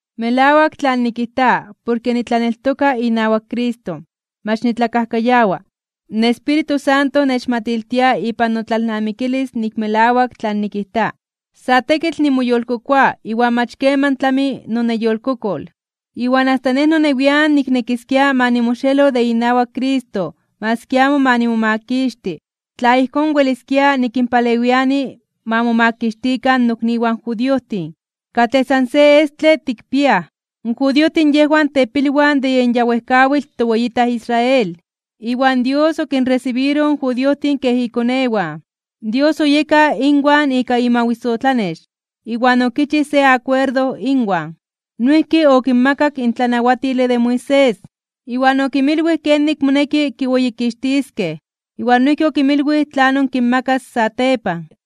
Melawak tlan nikijta porke nitlaneltoka inawak Cristo. Mach nitlakajkayawa. In Espíritu Santo nechmatiltia ipan notlalnamikilis nik melawak tlan nikijta. Sa tekitl nimoyolkokoa iwan mach keman tlami noneyolkokol. Iwan asta nej nonewian niknekiskia ma nimoxelo de inawak Cristo maski amo ma nimomakixti, tla ijkón weliskia nikinpalewiani ma momakixtikan nokniwan judiojtin, katlej san se estle tikpiaj. In judiojtin yejwan tepilwan de yen ya wejkawitl toweyitaj Israel, iwan Dios okinresibiroj in judiojtin kej ikonewan. Dios oyeka inwan ika imawisotlanex, iwan okichij se akuerdo inwan. Noijki okinmakak in tlanawatile de Moisés, iwan okinmilwij kenik moneki kiweyikixtiskej, iwan noijki okinmilwij tlanon kinmakas satepan.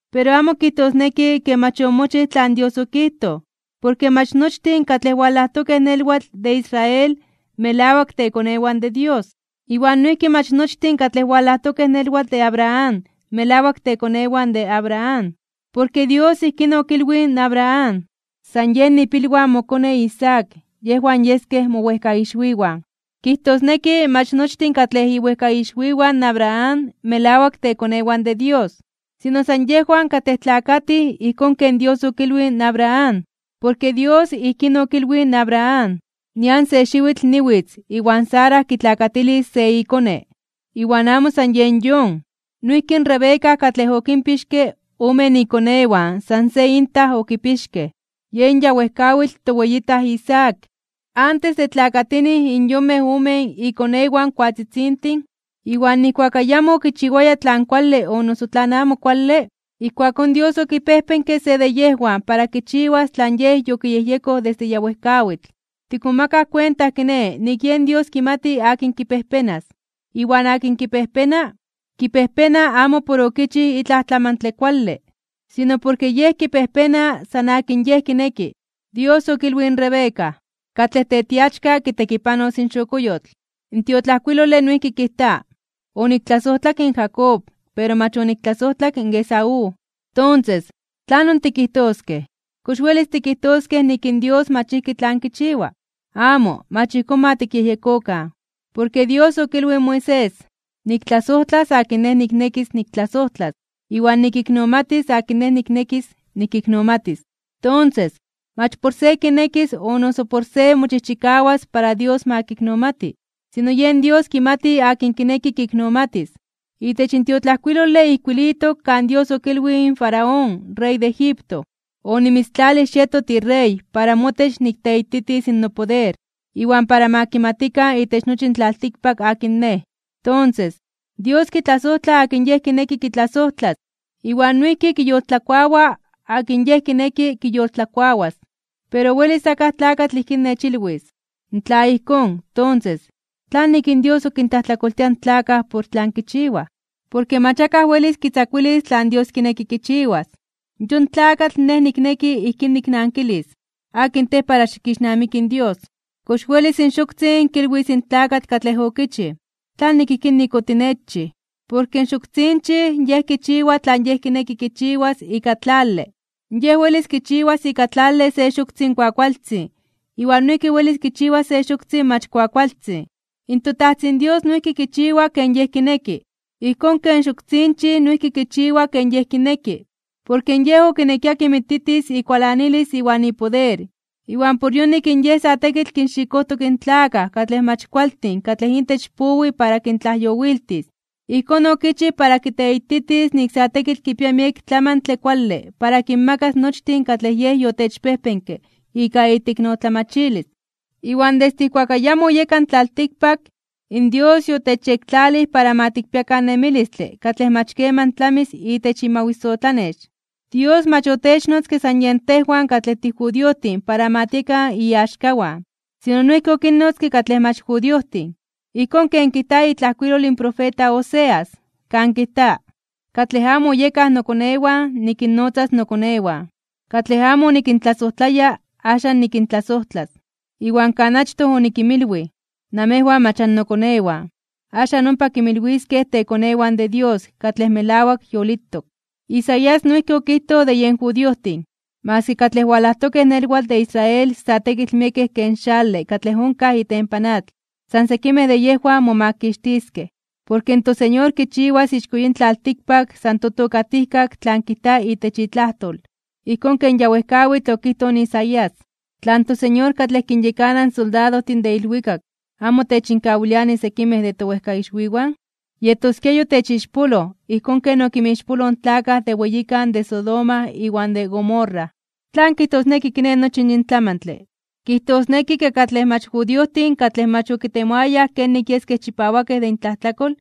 Pero amo kijtosneki ke mach omochij tlan Dios okijtoj, porke mach nochtin katlej walajtokej nelwatl de Israel melawak tekonewan de Dios. Iwan noijki mach nochtin katlej walajtokej nelwatl de Abraham melawak tekonewan de Abraham. Porke Dios ijkín okilwij in Abraham: “San yen ipilwan in mokone Isaac, yejwan yeskej mowejkaixwiwan.” Kijtosneki, mach nochtin katlej iwejkaixwiwan in Abraham melawak tekonewan de Dios, sino san yejwan katlej tlakatij ijkón ken Dios okilwij in Abraham. Porke Dios ijkín okilwij in Abraham: “Nian se xiwitl, niwitz, iwan Sara kitlakatilis se ikone.” Iwan amo san yen yon. Noijki in Rebeca katlej okinpixke omen ikonewan san se intaj okipixkej, yen ya wejkawitl toweyitaj Isaac. Antes de tlakatinij in yonmej omen ikonewan koatzitzintin, iwan nijkuak ayamo okichiwayaj tlan kuale o noso tlan amo kuale, ijkuakón Dios okipejpenke se de yejwan para kichiwas tlan Yej yokiyejyekoj desde ya wejkawitl. Tikmomakaj kuenta kiné nik yen Dios kimati akin kipejpenas, iwan akin kipejpena, kipejpena amo por okichij itlaj tlamantle kuale, sino porke Yej kipejpena san akin Yej kineki. Dios okilwij in Rebeca: “Katlej tetiachka kitekipanos in xokoyotl.” In tiotlajkuilole noijki kijta: “Oniktlasojtlak in Jacob, pero mach oniktlasojtlak in Esaú.” Tonses, ¿tlanon tikijtoskej? ¿Kox welis tikijtoskej nik in Dios mach ijki tlan kichiwa? Amo, mach ijkón ma tikyejyekokan. Porke Dios okilwij in Moisés: “Niktlasojtlas akin Nej niknekis niktlasojtlas, iwan nikiknomatis akin Nej niknekis nikiknomatis.” Tonses, mach por se kinekis o noso por se mochijchikawas para Dios ma kiknomati. Sino yen Dios kimati akin kineki kiknomatis. Itech in tiotlajkuilole ijkuilitok kan Dios okilwij in Faraón in rey de Egipto: “Onimitztlalij xieto tirey para motech nikteititis nopoder, iwan para ma kimatikan itech nochi in tlaltikpak akin Nej.” Tonses, Dios kitlasojtla akin Yej kineki kitlasojtlas, iwan noijki kiyoltlakuawa akin Yej kineki kiyoltlakuawas. Pero welis akaj tlakatl ijkín nechilwis: “Tla ijkón, tonses, ¿tlanik in Dios ok kintlajtlakoltia in tlakaj por tlan kichiwaj? Porke mach akaj welis kitzakuilis tlan Dios kineki kichiwas.” Yon tlakatl nej nikneki ijkín niknankilis: ¿Akin tej para xikixnamiki in Dios? ¿Kox welis in xoktzin kilwis in tlakatl katlej okichij: “¿tlanik ijkín nik otinechchij?” Porke in xoktzinchij yej kichiwa tlan yej kineki kichiwas ika tlale (barro). Yej welis kichiwas ika tlale se xoktzin kuakualtzin iwan noijki welis kichiwas se xoktzin mach kuakualtzin. ToTajtzin Dios noijki kichiwa ken Yej kineki, ijkón ken xoktzinchij noijki kichiwa ken yej kineki. Porke Yej okinekia kinmititis ikualanilis iwan ipoder, iwan por yonik in Yej sa tekitl kinxikojtok in tlakaj katlej mach kualtin katlej intech powi para kintlajyowiltis. Ijkón okichij para kiteititis nik sa tekitl kipia miek tlamantle kuale para kinmakas nochtin katlej Yej yotechpejpenke ika iteiknotlamachilis. Iwan desde ijkuak ayamo oyeka in tlaltikpak, in Dios yotechyektlalij para ma tikpiakan nemilistle katlej mach keman tlamis itech imawisotlanex. Dios mach otechnotzke san yen tejwan katlej tijudiojtin para ma tiekan iaxkawan, sino noijki okinnotzke katlej mach judiojtin. Ijkón ken kijta itlajkuilol in profeta Oseas, kan kijta: Katlej amo oyekaj nokonewan, nikinnotzas nokonewan. Katlej amo onikintlasojtlaya, axan nikintlasojtlas. Iwan kan achtoj onikinmilwij: “Namejwan mach annokonewan”, axan ompa kinmilwiskej tekonewan de Dios katlej melawak yolitok. Isaías noijki okijtoj de yen judiojtin: “Maski katlej walajtokej nelwatl de Israel sa tekitl miekej ken xale katlej onkaj itempan atl, san sekimej de yejwan momakixtiskej. Porke in toSeñor kichiwas ixko yin tlaltikpak san totokatijkak tlan kijta itech itlajtol.” Ijkón ken ya wejkawitl okijtoj in Isaías: Tla in toSeñor katlej kinyekana in soldadojtin de ilwikak amo techinkawiliani sekimej de towejkaixwiwan, yetoskia yotechixpoloj ijkón ken okinmixpoloj in tlakaj de weyikan de Sodoma iwan de Gomorra. ¿Tlan kijtosneki kiné nochi yin tlamantle? Kijtosneki ke katlej mach judiojtin katlej mach okitemoayaj kenik yeskej chipawakej de intlajtlakol,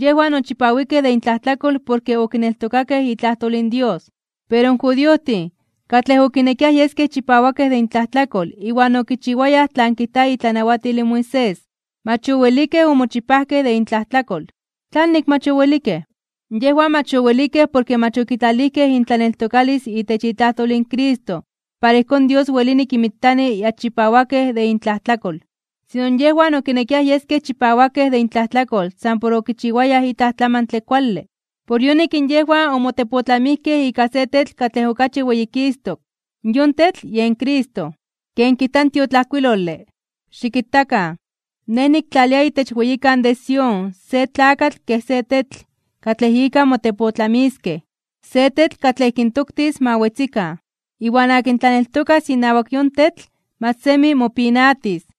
yejwan ochipawikej de intlajtlakol porke okineltokakej itlajtol in Dios. Pero in judiojtin, katlej okinekiaj yeskej chipawakej de intlajtlakol iwan okichiwayaj tlan kijta itlanawatil in Moisés, mach owelikej omochipajkej de intlajtlakol. ¿Tlanik mach owelikej? Yejwan mach owelikej porke mach okitlalijkej intlaneltokalis itech itlajtol in Cristo para ijkón Dios welini kinmitani ya chipawakej de intlajtlakol. Sino yejwan okinekiaj yeskej chipawakej de intlajtlakol san por okichiwayaj itlaj tlamantle kuale. Por yonik in yejwan omotepotlamijkej ika se tetl katlej okachi weyikistok (weyititok), yon tetl yen Cristo. Ken kijta in tiotlajkuilole: Xikitakan, Nej niktlalia itech weyikan de Sión se tlakatl kej se tetl katlej ika motepotlamiskej, se tetl katlej kintoktis ma wetzikan. Iwan akin tlaneltokas inawak yon tetl mach semi mopinatis.